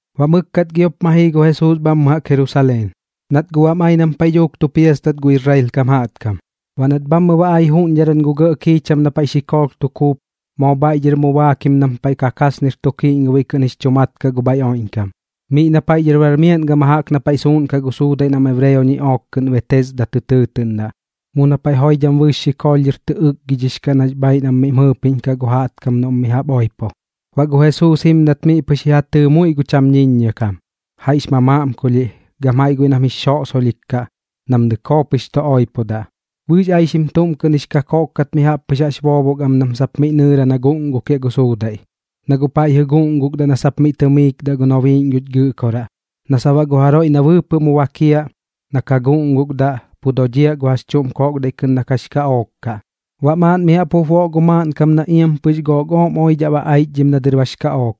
Baꞌ mɨkkat giop ma jii gu Jesuus bhammɨ jaꞌk Jerusaleen, nat guꞌ bam ai nam paiꞌ dhuuk tu piastat gu Israel kam jaꞌtkam. Baꞌ nat bhammɨ ba ai juꞌñdharan gu gɇꞌ kiicham na paiꞌ xikoolh tu kuup, moo bhaiꞌ dhɨr mu baakim nam paiꞌ Kakasnir tu Kiꞌñgobiꞌ kɨꞌn jix chu mat kaꞌ gu bhaiꞌ oiꞌñkam, miꞌ na paiꞌ dhɨr bar miaꞌn gama jaꞌk na paiꞌ suuꞌnkaꞌ gu suudaiꞌ nam ebreo ñiꞌook kɨꞌn Betesda tɨ tɨɨtɨꞌndaꞌ, mu na paiꞌ joidham bɨɨx xikoolh dhɨr tɨ ɨkgidhix kaꞌ nax bhaaiꞌ nam miꞌm jɨppiꞌñdhaꞌ gu jaꞌtkam noꞌm mi jaꞌp oipo. Baꞌ gu Jesuus jimdat miꞌ pɨx ji ja tɨɨ muiꞌ gu cham ñiññia kam, jaiꞌx mamaꞌmkulhiꞌ gam jaiꞌ guiꞌ nam jix xosoꞌsolhik kaꞌ nam dɨkoo pɨx tu oipodaꞌ. Bɨɨx aixim tuꞌm kɨꞌn jix kakoꞌk kat mi jaꞌp pɨx jaꞌx boobok am nam sap miꞌ nɨɨra na guꞌngukiaꞌ gu suudaiꞌ. Na guꞌ paiꞌ jɨꞌ guꞌngukdaꞌ na sap miꞌ tɨmiikdaꞌ gu nobiiꞌñ guch Gɨꞌkoraꞌ, na sap baꞌ gu jaroiꞌ na bɨɨpɨꞌ mi bakiaꞌ na ka guꞌngukdaꞌ, pu dodhiaꞌ gu jax chuꞌm koꞌkdaiꞌ na kɨꞌn kax kaꞌook kaꞌ. Baꞌ maaꞌn mi jaꞌp jup boꞌ gu maaꞌnkam na iam pɨx gook ooꞌm oidhaꞌ ba aichdhim na dɨr bax kaꞌook,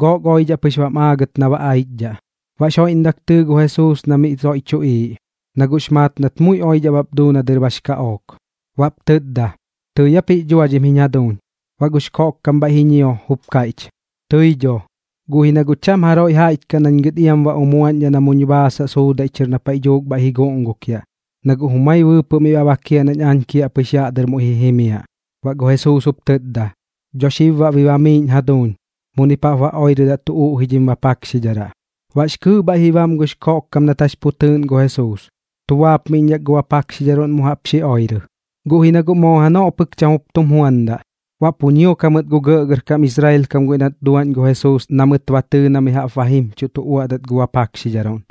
gook oidhaꞌ pɨx bam aagɨt na ba aichdhaꞌ. Baꞌx joiꞌndak tɨɨ gu Jesuus na miꞌ soiꞌ tuꞌiiꞌ, na guꞌx maat nat muiꞌ oidhaꞌ bap duu na dɨr bax kaꞌook. Baꞌp tɨtda: ―¿Tɨi aap jix dhuadhim jiñ jaduuñ? Baꞌ gux koꞌkkam bhaiꞌ ji ñio, jup kaiꞌch: ―Tɨi dho, guꞌ ji na guꞌ cham jaroiꞌ jaiꞌch kaꞌ nañ gɨt iam ba umuaꞌñdhaꞌ na muñ baasaꞌ suudaiꞌ chɨr na paiꞌ dhuuk bhaiꞌ ji guꞌngukiaꞌ, na guꞌ jumai bɨɨpɨꞌ miꞌ ba bakiaꞌ nañ aañ kiaꞌpɨx yaꞌ dɨr mu ji jimiaꞌ. Baꞌ gu Jesuus jup tɨtda: ―Dho xib baꞌ bi bamiiꞌñ jaduuñ. Muni paꞌp ba oirɨdaꞌ tu uꞌji dhim bapakxidharaꞌ. Baꞌx kɨɨꞌ bhaiꞌ ji bam gux koꞌkkam nat jax pu tɨɨꞌn gu Jesuus, tu baapmiꞌñdhak gu bapakxidharuꞌn mu jaꞌp xi oirɨ. Guꞌ ji na guꞌ moo janoꞌ pɨk cham jup tum juandaꞌ. Baꞌ pu ñiok jamɨt gu gɇꞌgɇrkam Israel kam guiꞌ nat duaꞌñ gu Jesuus na mɨt ba tɨɨ na mi jaꞌp ba jimchuꞌ tu uaꞌdat gu bapakxidharuꞌn,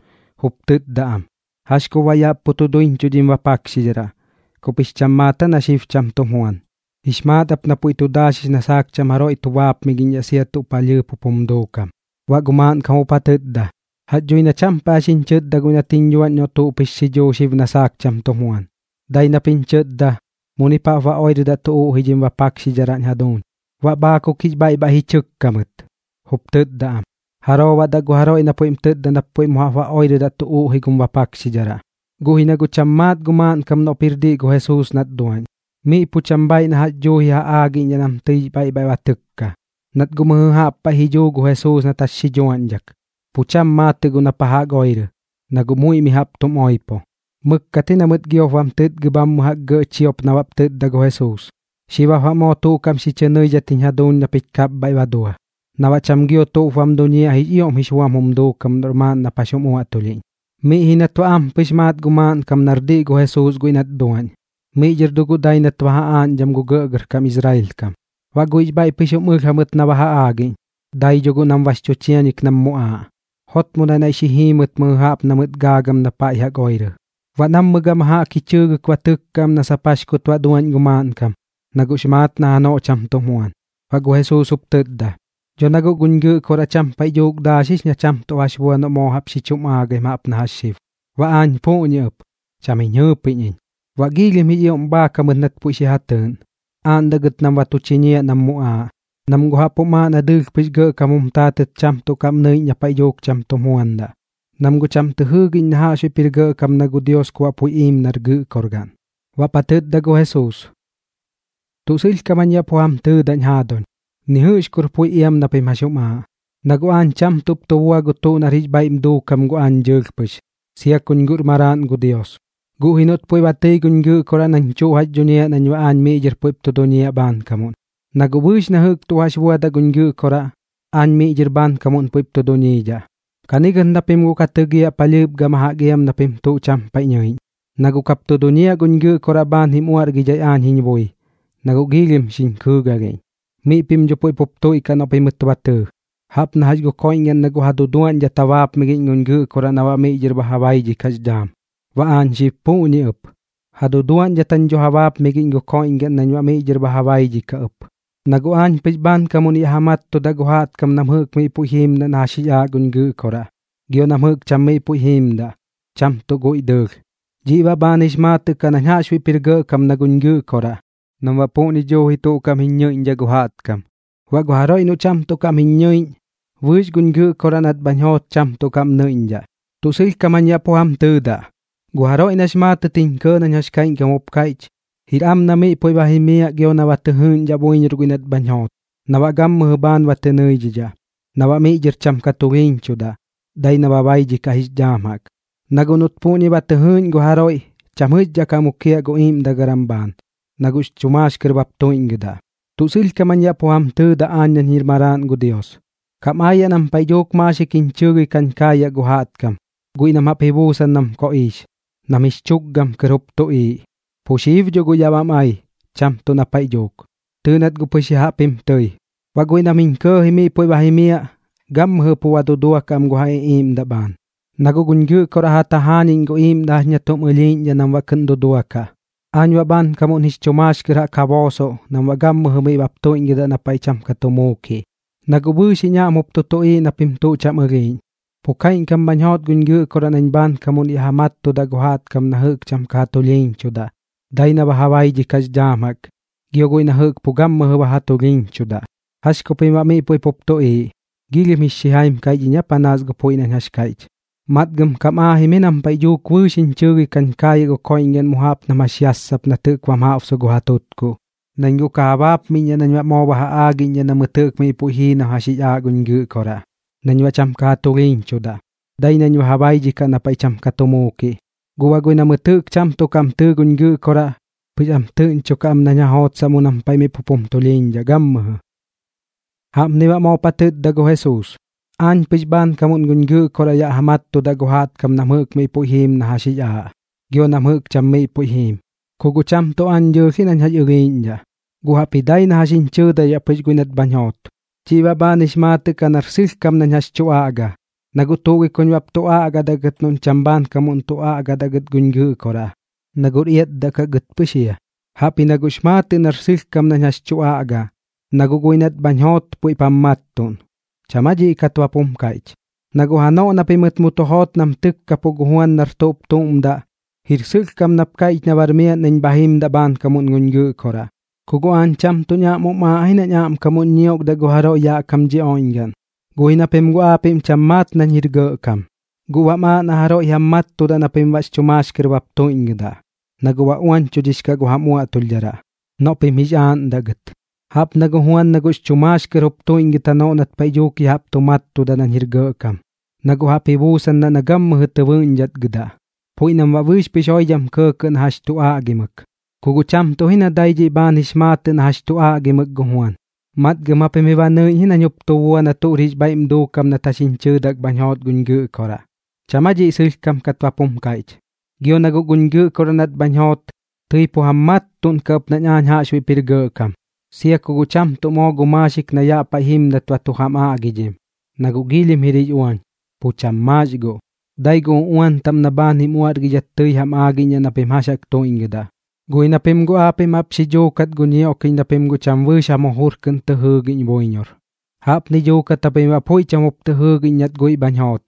jup tɨtda am: ―¿Jax kup baꞌ yaꞌ pu tu duiñchuꞌ dhim bapakxidharaꞌ? ¿Kup jix cham maat aa na xib cham tum juan? Jix maat ap na puiꞌ tu daaxix na saak cham jaroiꞌ tu baapmigiꞌñdhaꞌ sia gu tuꞌ palhɨɨp jup jum duukam. Baꞌ gu maaꞌnkam jup ja tɨtda: ―Jax dhui na cham paiꞌ jax jiñ chɨtda guiꞌ nat jiñ dhuaꞌñ noꞌ tuꞌp jix xidhuu xib na saak cham tum juan. Dai nap jiñ chɨtda: “Munip jaꞌp ba oirɨdaꞌ tu uꞌji dhim bapakxidharaꞌñ jaduuñ.” Baꞌ bhaakuk jix bhaiꞌ bhaiꞌ ji chɨkka mɨt, jup tɨtda am: ―¿Jaroo baꞌ daꞌ gu jaroiꞌ na puiꞌm tɨtda nap puiꞌ mu jaꞌp ba oirɨdaꞌ tu uꞌji gum bapakxidharaꞌ? Guꞌ ji na guꞌ cham maat gu maaꞌnkam noꞌp jir diꞌ gu Jesuus nat duaꞌñ. Miꞌ pu cham bhaaiꞌ na jax dhuuji ja aagiꞌñdhaꞌ nam tɨix bhaiꞌ bhaiꞌ ba tɨkka, nat guꞌ mɨjɨ jaꞌp paiꞌ ji dhuu gu Jesuus nat jax xi dhuaꞌñdhak. Pu cham maatɨꞌ guꞌ na pa jaꞌk oirɨ, na guꞌ muiꞌ mi jaꞌp tum oipo. Mɨkkat ji na mɨt baꞌ giop bam tɨtgɨ bhammɨ jaꞌk gɇꞌ chiop na baꞌp tɨtda gu Jesuus: ―Xib jap moo tuꞌ kaꞌm xi chɨ nɨidhat jiñ jaduuñ na pich kapbhaiꞌ ba dua, na baꞌ cham gio tuꞌp bam duñiaꞌ jix ioꞌm jix buam jum duukam noꞌr maaꞌn nap jax jum uaꞌtulhiꞌñ. Miꞌ ji nat baꞌ ampɨx maat gu maaꞌnkam nar diꞌ gu Jesuus guiꞌ nat duaꞌñ, miꞌ dhɨr dho guꞌ dai nat ba ja aaꞌñdham gu gɇꞌgɇrkam Israel kam. Baꞌ guiꞌx bhaiꞌ pɨx jup jum ɨlh jamɨt na ba ja aagiꞌñ, dai dho guꞌ nam bax chu chianik nam muꞌaaꞌ. Jotmodaꞌ naiꞌ xi jii mɨt mɨjɨ jaꞌp na mɨt gaagam na pa jaꞌk oirɨ. Baꞌ nammɨ gama jaꞌk ji chɨɨgɨk ba tɨkka am na sap jax kut baꞌ duaꞌñ gu maaꞌnkam, na guꞌx maat na janoꞌ cham tum juan. Baꞌ gu Jesuus jup tɨtda: ―Dho na guꞌ guñ Gɨꞌkoraꞌ cham paiꞌ dhuuk daaxix na cham tuꞌ jax bua noꞌ moo jaꞌp xi chum aagaim jaꞌp na jax xib. Baꞌ aañ puꞌñi ɨp, cham jiñ jɨɨpiꞌñ iñ. Baꞌ giilhim jix ioꞌm bhaak jamɨt nat puiꞌ xi ja tɨɨꞌn, aaꞌndaꞌ gɨt nam ba tu chiñiaꞌ nam muꞌaaꞌ. Nam guꞌ jaꞌp jum aaꞌ na dɨɨlh pɨx gɇꞌkam jum taatɨt cham tuꞌ kaꞌm nɨiꞌñ na paiꞌ dhuuk cham tum juandaꞌ, nam guꞌ cham tɨ jɨɨgiꞌñ na jaꞌxbuiꞌp jir gɇꞌkam na gu Dios ku baꞌ puiꞌ iim nar Gɨꞌkorgaꞌn. Baꞌp ja tɨtda gu Jesuus: ―Tuꞌ sɨlhkam jañ yaꞌ pu jam tɨɨdaꞌñ jaaduñ, ni jɨꞌx kur puiꞌ iam na pim jax jum aaꞌ. Na guꞌ aañ cham tuꞌp tu bua gu tuꞌ nar jix bhaiꞌm duukam gu aañ dɨɨlh pɨx, sia kuñ jir maraaꞌn gu Dios, guꞌ ji noꞌt puiꞌ ba tɨi guñ Gɨꞌkoraꞌ nañ tuꞌ jax duñiaꞌ nañ baꞌ aañ miꞌ dhɨr puiꞌp tu duñiaꞌ bhaankamuꞌn. Na guꞌ bɨɨx na jɨꞌk tuꞌ jax buadaꞌ guñ Gɨꞌkoraꞌ, aañ miꞌ dhɨr bhaankamuꞌn puiꞌp tu duñiidhaꞌ. Ka gɨt na pim guꞌ ka tɨgiaꞌ palhɨɨp gama jaꞌk iam na pim tuꞌ cham paiꞌ nɨiꞌñ, na guꞌ kap tu duñiaꞌ guñ Gɨꞌkoraꞌ bhaan jim uaꞌrgidhai aañ jiñ bui, na guꞌ giilhim xiñ kɨɨgalhiꞌñ. Miꞌ pim dho puiꞌ pup tuiꞌkaꞌ noꞌ pimɨt ba tɨɨ. Jaꞌp na jax gu koiꞌñgaꞌn na guꞌ ja duduaꞌñdhat ja baapmigiꞌñ guñ Gɨꞌkoraꞌ na baꞌ miꞌ dhɨr ba ja baidhikaꞌx dhaam, baꞌ aañ xib puꞌñi ɨp, ja duduaꞌñdhat jañ dho ja baapmigiꞌñ gu koiꞌñgaꞌn nañ baꞌ miꞌ dhɨr ba ja baidhikaꞌ ɨp. Na guꞌ aañ pɨx bhaankamuꞌn yaꞌ ja mattudaꞌ gu jaꞌtkam nam jɨꞌk miꞌ puiꞌ jiimdaꞌ na jax jix aaꞌ guñ Gɨꞌkoraꞌ, gio nam jɨꞌk cham miꞌ puiꞌ jiimdaꞌ, cham tuꞌ guiꞌ dɨɨlh. Dhiꞌ baꞌ bhaan jix maatɨꞌ kaꞌ nañ jaꞌxbuiꞌp jir gɇꞌkam na guñ Gɨꞌkoraꞌ nam baꞌ puꞌñi dhuuji tuꞌ kaꞌm jiñ ñɨiꞌñdhaꞌ gu jaꞌtkam. Baꞌ gu jaroiꞌ noꞌ cham tuꞌ kaꞌm jiñ ñɨiꞌñ, bɨɨx guñ Gɨꞌkoraꞌ nat bhañ joot cham tuꞌ kaꞌm nɨiꞌñdhaꞌ. ’Tuꞌ sɨlhkam jañ yaꞌ pu jam tɨɨdaꞌ, gu jaroiꞌ nax maatɨt jiñ kɇɇ nañ jax kaiꞌñkam jup kaiꞌch, jir am na miꞌ puiꞌ ba jimiaꞌ gio na ba tɨ jɨɨꞌñdhaꞌ buiñor guiꞌ nat bhañ joot, na baꞌ gammɨjɨ bhaan ba tɨ nɨidhidhaꞌ, na baꞌ miꞌ dhɨr cham ka tulhiiñchudaꞌ, dai na ba baidhikaꞌ jix dhaam jaꞌk. Na guꞌ noꞌt puꞌñi ba tɨ jɨɨꞌñ gu jaroiꞌ, cham jɨꞌxdhaꞌ ka mukiaꞌ gu iiꞌmdagaram bhaan, na guꞌx chu maax kɨr bap tuiꞌñgɨdaꞌ. Tuꞌ sɨlhkam jañ yaꞌ pu jam tɨɨdaꞌ aañ nañ jir maraaꞌn gu Dios, kam aayaꞌ nam paiꞌ dhuuk maaxik jiñ chɨɨgɨi kañ kaayaꞌ gu jaꞌtkam, guiꞌ nam jaꞌp ji buusan nam koꞌiix, nam jix chukgam kɨr jup tuꞌiiꞌ. Pu xib dho guꞌ yaꞌ bam ai, cham tuꞌ na paiꞌ dhuuk. Tɨɨꞌ nat guꞌ pɨx ya jaꞌp jim tɨi. Baꞌ guiꞌ nam jiñ kɇɇji miꞌ puiꞌ ba jimiaꞌ, gammɨjɨ pu ba duduakaꞌ am gu ja iꞌiiꞌmdaꞌ am bhaan, na guꞌ guñ Gɨꞌkoraꞌ ja tajaañiꞌñ gu iiꞌmdaꞌ na jax chuꞌm ɨlhiiꞌñdhaꞌ nam baꞌ kɨꞌn duduakaꞌ. Aañ baꞌ bhaankamuꞌn jix chu maax kɨr jaꞌk ja boosoꞌ nam baꞌ gammɨjɨ miꞌ bap tuiꞌñgɨdaꞌ na paiꞌ cham ka tu muukiꞌ. Na guꞌ bɨɨx jiñ aꞌm jup tu tuꞌiiꞌ na pim tuꞌ cham ɨlhiiꞌñ, pu kaiꞌñkam bhañ joot guñ Gɨꞌkoraꞌ nañ bhaankamuꞌn yaꞌ ja mattudaꞌ gu jaꞌtkam na jɨꞌk cham ka ja tulhiiñchudaꞌ, dai na ba ja baidhikaꞌx dhaam jaꞌk, gio guiꞌ na jɨꞌk pu gammɨjɨ ba ja tulhiiñchudaꞌ. ¿Jax ku pim baꞌ miꞌ puiꞌ pup tuꞌiiꞌ? ¿Giilhim jix xijai aa panaas gu puiꞌ nañ jax kaiꞌch? Matgam kam aajim ji nam paiꞌ dhuuk bɨɨx jiñ chɨɨgɨi kañ kaayaꞌ gu koiꞌñgaꞌn mu jaꞌp nam jax yassap nat jɨꞌk bam jaꞌbsu gu ja tutkuꞌ. Nañ guꞌ ka ja baapmiꞌñdhaꞌ nañ baꞌ moo ba ja aagiꞌñdhaꞌ na mɨt jɨꞌk miꞌ puiꞌ jii na jax jix aaꞌ guñ Gɨꞌkoraꞌ nañ baꞌ cham ka ja tulhiiñchudaꞌ, dai nañ ba ja baidhikaꞌ na paiꞌ cham ka tu muukiꞌ. Guꞌ baꞌ guiꞌ na mɨt jɨꞌk cham tuꞌ kaꞌm tɨɨ guñ Gɨꞌkoraꞌ, pɨx am tɨꞌñchokaꞌ am nañ ja jootsaꞌ mu nam paiꞌ miꞌ pup jum tulhiiñdhaꞌ gammɨjɨ. Jaꞌpni baꞌ moop ja tɨtda gu Jesuus: ―Aañ pɨx bhaankamuꞌn guñ Gɨꞌkoraꞌ yaꞌ ja mattudaꞌ gu jaꞌtkam nam jɨꞌk miꞌ puiꞌ jiim na jax jix aaꞌ, gio nam jɨꞌk cham miꞌ puiꞌ jiim. Ku guꞌ cham tuꞌ aañ dɨɨlh ji nañ jax ɨlhiiꞌñdhaꞌ, guꞌ jaꞌpji dai na jax jiñ chɨɨdaidhaꞌ pɨx guiꞌ nat bhañ joot. Dhiꞌ baꞌ bhaan jix maatɨꞌ kaꞌ nar sɨlhkam nañ jax tu aꞌga, na guꞌ tuꞌ gi kuñ bap tu aꞌgadaꞌ gɨt noꞌñ cham bhaankamuꞌn tu aꞌgadaꞌ gɨt guñ Gɨꞌkoraꞌ, na guꞌr iatdaꞌ kaꞌ gɨt pɨx jia. Jaꞌpji na guꞌx maatɨꞌ nar sɨlhkam nañ jax tu aꞌga, na guꞌ guiꞌ nat bhañ joot puiꞌp jam mattuꞌn. ¿Cham aa dhiꞌ kat bap jum kaiꞌch? Na guꞌ janoꞌ na pimɨt mu tu joot nam tɨkkapuꞌ gu Juan nar tuꞌp tuꞌm daꞌ, jir sɨlhkam nap kaiꞌch na bar miaꞌn nañ bha jim bhaankamuꞌn guñ Gɨꞌkoraꞌ. Ku guꞌ aañ cham tuꞌñ aꞌm jum aaꞌ ji nañ aꞌmkamuꞌn ñiokdaꞌ gu jaroiꞌ yaꞌ kam dhi oiꞌñgaꞌn. Guꞌ ji na pim guꞌ aapiꞌm cham maat nañ jir gɇꞌkam, guꞌ baꞌm aaꞌ na jaroiꞌ jam mattudaꞌ na pim baꞌx chu maax kɨr bap tuiꞌñgɨdaꞌ, na guꞌ ba uañchudhix kaꞌ gu jam uaꞌtulhdharaꞌ noꞌ pim jix aaꞌndaꞌ gɨt. Jaꞌp na gu Juan nax chu maax kɨr jup tuiꞌñgɨt janoꞌ nat paiꞌ dhuuk ya jaꞌp tu mattudak nañ jir gɇꞌkam, na guꞌ jaꞌp ji buusandaꞌ na gammɨjɨ tɨ bɨꞌñdhatgɨdaꞌ, puiꞌ nam baꞌ bɨɨx pɨx joidham kɇɇkɇt na jax tu aꞌgimɨk. Ku guꞌ cham tuꞌ ji na dai dhiꞌ bhaan jix maatɨꞌ na jax tu aꞌgimɨk gu Juan, matgam japim ji ba nɨiꞌñ ji nañ jup tu bua na tuꞌr jix bhaiꞌm duukam nat jax jiñ chɨɨdak bhañ joot guñ Gɨꞌkoraꞌ. ¿Cham aa dhiꞌ sɨlhkam kat bap jum kaiꞌch? Gio na guꞌ guñ Gɨꞌkoraꞌ nat bhañ joot, tɨi pu jam mattuꞌnkaꞌ ɨp nañ aañ jaꞌxbuiꞌp jir gɇꞌkam, sia ku guꞌ cham tuꞌ moo gu maaxik na yaꞌ paiꞌ jimdat ba tu jam aꞌgidhim, na guꞌ giilhim jir jix uañ, pu cham maax guꞌ. Dai gu uꞌuan taꞌm na bhaan jim uaꞌrgidhat tɨi jam aagiꞌñ na pim jax jaꞌk tuiꞌñgɨdaꞌ. Guꞌ ji na pim guꞌ aapiꞌm jaꞌp xi dhuukat gu ñioꞌkiꞌñ na pim guꞌ cham bɨɨx jam jujur kɨꞌn tɨ jɨɨgiꞌñ buiñor. Jaꞌpni dhuukat japim baꞌ puiꞌ cham jup tɨ jɨɨgiꞌñ nat guiꞌ bhañ joot,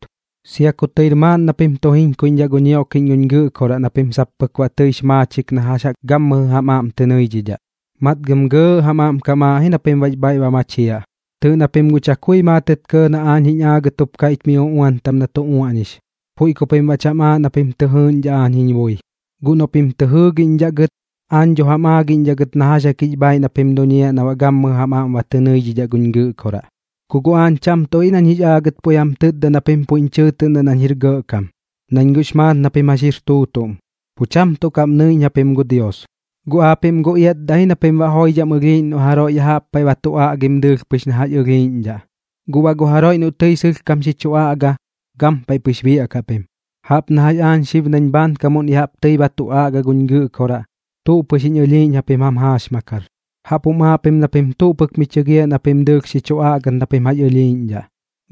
sia ku tɨir maaꞌn na pim tu jiñkuiꞌñdhaꞌ gu ñioꞌkiꞌñ guñ Gɨꞌkoraꞌ na pim sap pɨk baꞌ tɨix maachik na jax jaꞌk gammɨjɨ jam aꞌm tɨ nɨidhidhaꞌ. Matgam gɇɇꞌ jam aꞌm kam aaꞌ ji na pim baꞌx bhaiꞌ ba machiaꞌ. Tɨɨꞌ na pim guꞌ chakui maatɨt kɇɇ na aañ jiñ aagɨt jup kaiꞌch mi uꞌuan taꞌm na tu uaꞌñix, puiꞌ ku pim baꞌ cham aaꞌ na pim jɨɨꞌñdhaꞌ aañ jiñ bui. Guꞌ noꞌ pim tɨ jɨɨgiꞌñdhaꞌ gɨt, aañ dho jam aagiꞌñdhaꞌ gɨt na jax jaꞌk jix bhaaiꞌ na pim duñiaꞌ na baꞌ gammɨjɨ jam aꞌm ba tɨ nɨidhidhaꞌ guñ Gɨꞌkoraꞌ. ’Ku guꞌ aañ cham tuꞌ ji nañ jix aagɨt puiꞌ jam tɨtda na pim puiꞌñ chɨɨtɨꞌn nañ jir gɇꞌkam. Nañ guꞌx maat na pim jax jir tuutuꞌm, pu cham tuꞌ kaꞌm nɨiꞌñ japim gu Dios. Guꞌ aapiꞌm guꞌ iatdaꞌ ji na pim joidham ɨlhiiꞌñ noꞌ jaroiꞌ ya jaꞌp paiꞌ ba tu aꞌgim dɨɨlh pɨx na jax ɨlhiiꞌñdhaꞌ, guꞌ baꞌ gu jaroiꞌ noꞌ tɨi sɨlhkam xi chu aꞌga, gampaiꞌ pɨx biaꞌkaꞌ pim. Jaꞌp na jax aañ xib nañ bhaankamuꞌn ya jaꞌp tɨi ba tu aꞌga guñ Gɨꞌkoraꞌ, tuꞌ pɨx jiñ ɨlhiiꞌñ japim jam jaaxmakar. Jaꞌp jum aaꞌ pim na pim tuꞌ pɨk mi chɨgiaꞌ na pim dɨɨlh xi chu aꞌgat na pim jax ɨlhiiꞌñdhaꞌ,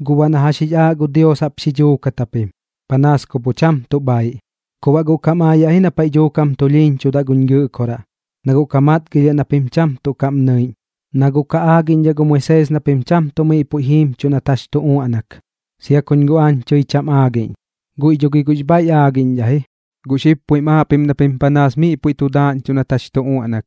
guꞌ baꞌ na jax jix aaꞌ gu Dios jaꞌp xi dhuukat japim, panaas ku pu cham tuꞌ bhaiꞌ. Ku baꞌ guꞌ kam aayaꞌ ji na paiꞌ dhuuk jam tulhiiñchudaꞌ guñ Gɨꞌkoraꞌ, na guꞌ ka matgilhiaꞌ na pim cham tuꞌ kaꞌm nɨiꞌñ, na guꞌ ka aagiꞌñdhaꞌ gu Moisees na pim cham tuꞌ miꞌ puiꞌ jiimchuꞌ nat jax tu uaꞌnak. Sia kuñ guꞌ aañ tɨi cham aagiꞌñ, guiꞌ dho gi guꞌx bhaiꞌ aagiꞌñdhaꞌ ji. Gu xib puiꞌm aaꞌ pim na pim panaas miꞌ puiꞌ tu daaꞌñchuꞌ nat jax tu uaꞌnak.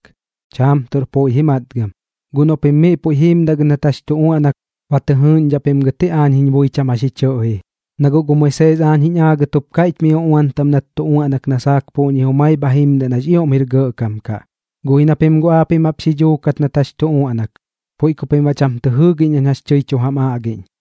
Chaam tuꞌr puiꞌ ji matgam. Guꞌ noꞌ pim miꞌ puiꞌ jiimdaꞌ gɨt nat jax tu uaꞌnak, ba tɨ jɨɨꞌñdhaꞌ pim gɨt ji aañ jiñ bui cham jax ji chɨꞌji. Na guꞌ gu Moisees aañ jiñ aagɨt jup kaiꞌch mi uꞌuan taꞌm nat tu uaꞌnak na saak puꞌñi jumai bha jimdaꞌ nax ioꞌm jir gɇꞌkam kaꞌ. Guꞌ ji na pim guꞌ jaꞌp xi dhuukat nat jax tu uaꞌnak, puiꞌ ku pim baꞌ cham tɨ jɨɨgiꞌñ nañ jax tɨi tu jam aꞌgiꞌñ.